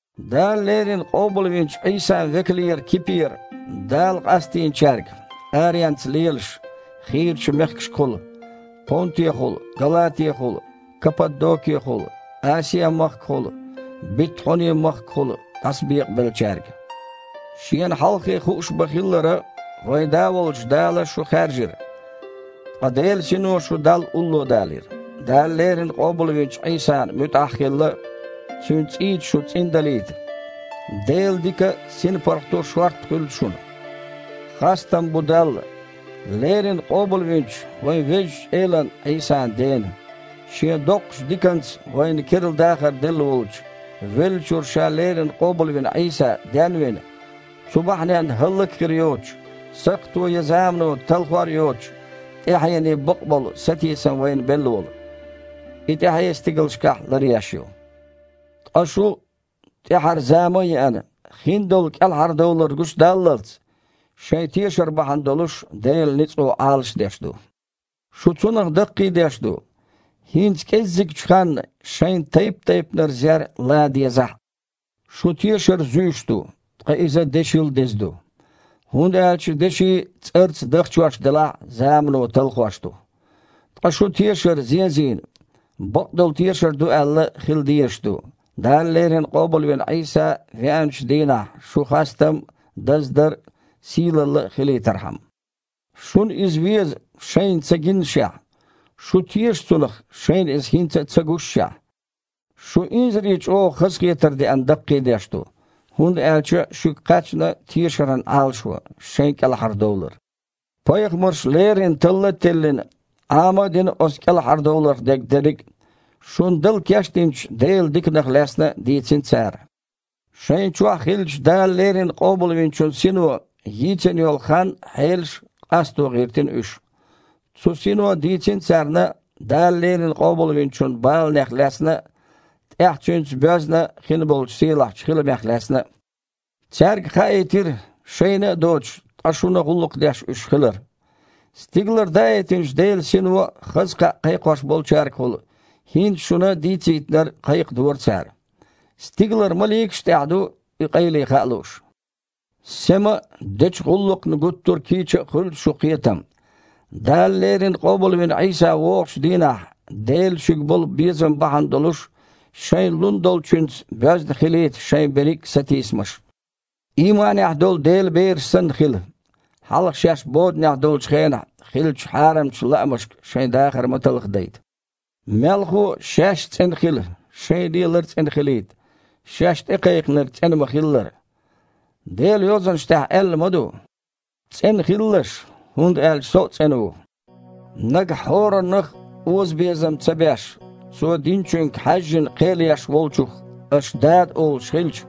Дала леррина къобалвинчу Іийсан векалера Кипера Дала къастийначаьрга, аренца лелаш, хийрачу мехкашкахула: Понтехула, Галатехула, Каппадонехула, Асиа-махкахула, Битхьуни-махкахула дІасабекъабеллачаьрга. Шена хьалххе хууш ма-хиллара, вайн Да волчу Дала шу хаьржира. Ткъа Делан Сино шу Далла улло далийра, Дала леррина къобалвинчу Іийсана муьтІахь а хилла, Цуьнан цІийца шу цІиндалийта. Делан дика а, синпаргІато а шорта хуьлда шуна! Хастам бу Далла, леррина къобалвинчу вайн Везачу Элан Іийсан Дена, Шен доккхачу диканца вайна керла дахар делла волчу, веллачуьра Ша леррина къобалвина Іийса ден а вина, цу бахьаненна хІаллак а хир йоцучу, сакхто я замано талхор а йоцучу тІаьхьене бакъболу сатийсам вайна белла волу. И тІаьхье стигалшкахь ларъеш ю, ткъа шу, тІаьхьара зама а еана, хиндолу кІелхьардовлар гучудаллалц, шайн тешар бахьана долуш Делан ницкъо Іалашдеш ду. Шу цунах даккхийдеш ду, хІинца кІеззигчу ханна шайна тайп-тайпанара зер лан дезахь а. Шун тешар зуьйш ду, ткъа иза дешил деза ду. ХІунда аьлча деши, цІарца дахчош делахь а, замано талхош ду. Ткъа шун тешар, зен а зийна, бакъдолу тешар ду аьлла, хила дезаш ду, Дала леррина къобалвина Іийса веанчу дийнахь шун хастам а, даздар а, сийлалла а хилийтархьама. Шуна Иза веза, шайна ца гиннашехь. Шу теша Цунах, шайна Иза хІинца а ца гушшехь. Шу, инзаре чІогІа хазахетар деана, даккхийдеш ду, хІунда аьлча шуьга кхаьчна тешаран Іалашо: шайн кІелхьардовлар. Пайхамарша леррина талла а теллина, Іама а дина оцу кІелхьардовларх дерг дерриг а. Шуна дала кечдинчу Делан диканах лаьцна а дийцина цара. Шайна чохь хиллачу Дала леррина Къобалвинчун Сино йийцина йолу хан а, хьелаш а къасто гІиртина уьш. Цу Сино дийцина царна Дала леррина Къобалвинчун баланех лаьцна а, тІаьхьа Цуьнца боьзна хин болчу сийлахьчу хиламех лаьцна а. Цаьрга хаийтира, шайна а доцуш, ткъа шуна гІуллакх деш уьш хилар. Стигалара даийтинчу Делан Сино хаза кхаъ кхайкхош болчаьргахула хІинца шуна дийцийтинарг кхайкхадора цара. Стигалара маликаш а тІехь ду и къайле хаа лууш. Сема а, дечу гІуллакхна гуттар а кийча а хуьлда шун кхетам. Дала леррина къобалвина Іийса вогІучу дийнахь Делан шуьга болу безам бахьана долуш шайна лун долчуьнца боьзна хилийта шайн берриг а сатийсамаш. Ийманехь долу Делан бераш санна хила, хьалха шаьш боданехь долчу хенахь хиллачу хьарамчу лаамашка шайн дахар ма талхадайта. Мелхо а, шаьш а цІена хила, шайн лелар а цІена хилийта, шаьш ТІекхайкхинарг цІена ма-хиллара. Делан Йозанаш тІехь аьлла ма ду: «ЦІена хилалаш, хІунда аьлча Со а цІена ву». Нагахь хІораннах а озабезам ца беш, цо диначуьнга хьаьжжина кхел еш Волчух аша Дада олуш хилча,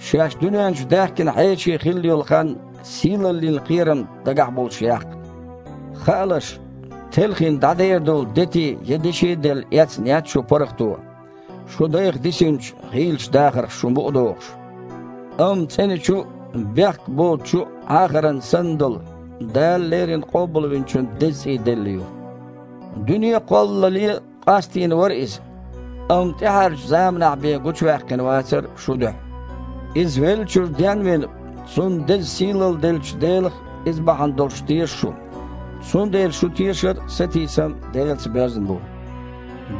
шаьш дуьнен чу даьхкина хьеший хилла йолу хан сийлаллин кхерам дагахь а болуш яккха. Хаалаш, телхина дІадер долу дети я деши а делла эцна яц шун паргІато, шун дайх дисинчу гІийлачу дахарх шу мукъадохуш, амма цІеначу а, бехк боцучу а Іахаран санна долу, Дала леррина Къобалвинчун деза цІий делла ю. Дуьне а кхоллале къастийна вара Иза, амма тІаьхьарчу заманахь бен гучуваьккхина вацара шун дуьхьа. Иза веллачуьра ден а вина, Цунна деза сийлалла деллачу Делах а Иза бахьана долуш теша шу, цундела шун тешар а, сатийсам а Делаца боьзна бу.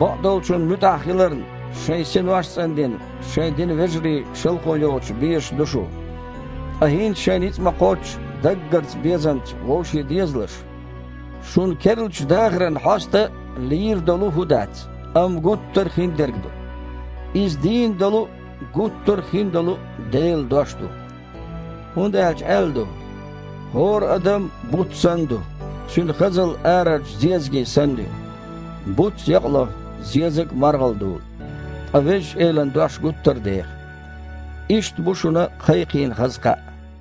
Бакъдолчунна муьтІахь хиларна, шайн синош а цІандина, шайн динан вежарий шалхо йоцуш безаш ду шу. Ткъа хІинца шайн ницкъ ма-кхоччу даггарчу безамца вовше дезалаш! Шун керлачу дахаран хьоста лийр долу хІу дац, амма гуттар а хин дерг ду. Иза дийна долу а, гуттар а хин долу а Делан Дош ду! ХІунда аьлча аьлла ду: «Адамаш буц санна ду, церан хазалла аренан зезаг санна ю. Буц якъаелча, зезаг а дужу, ткъа Везачу Элан Дош гуттар а деха». Иштта бу шуна кхайкхийна хаза кхаъ!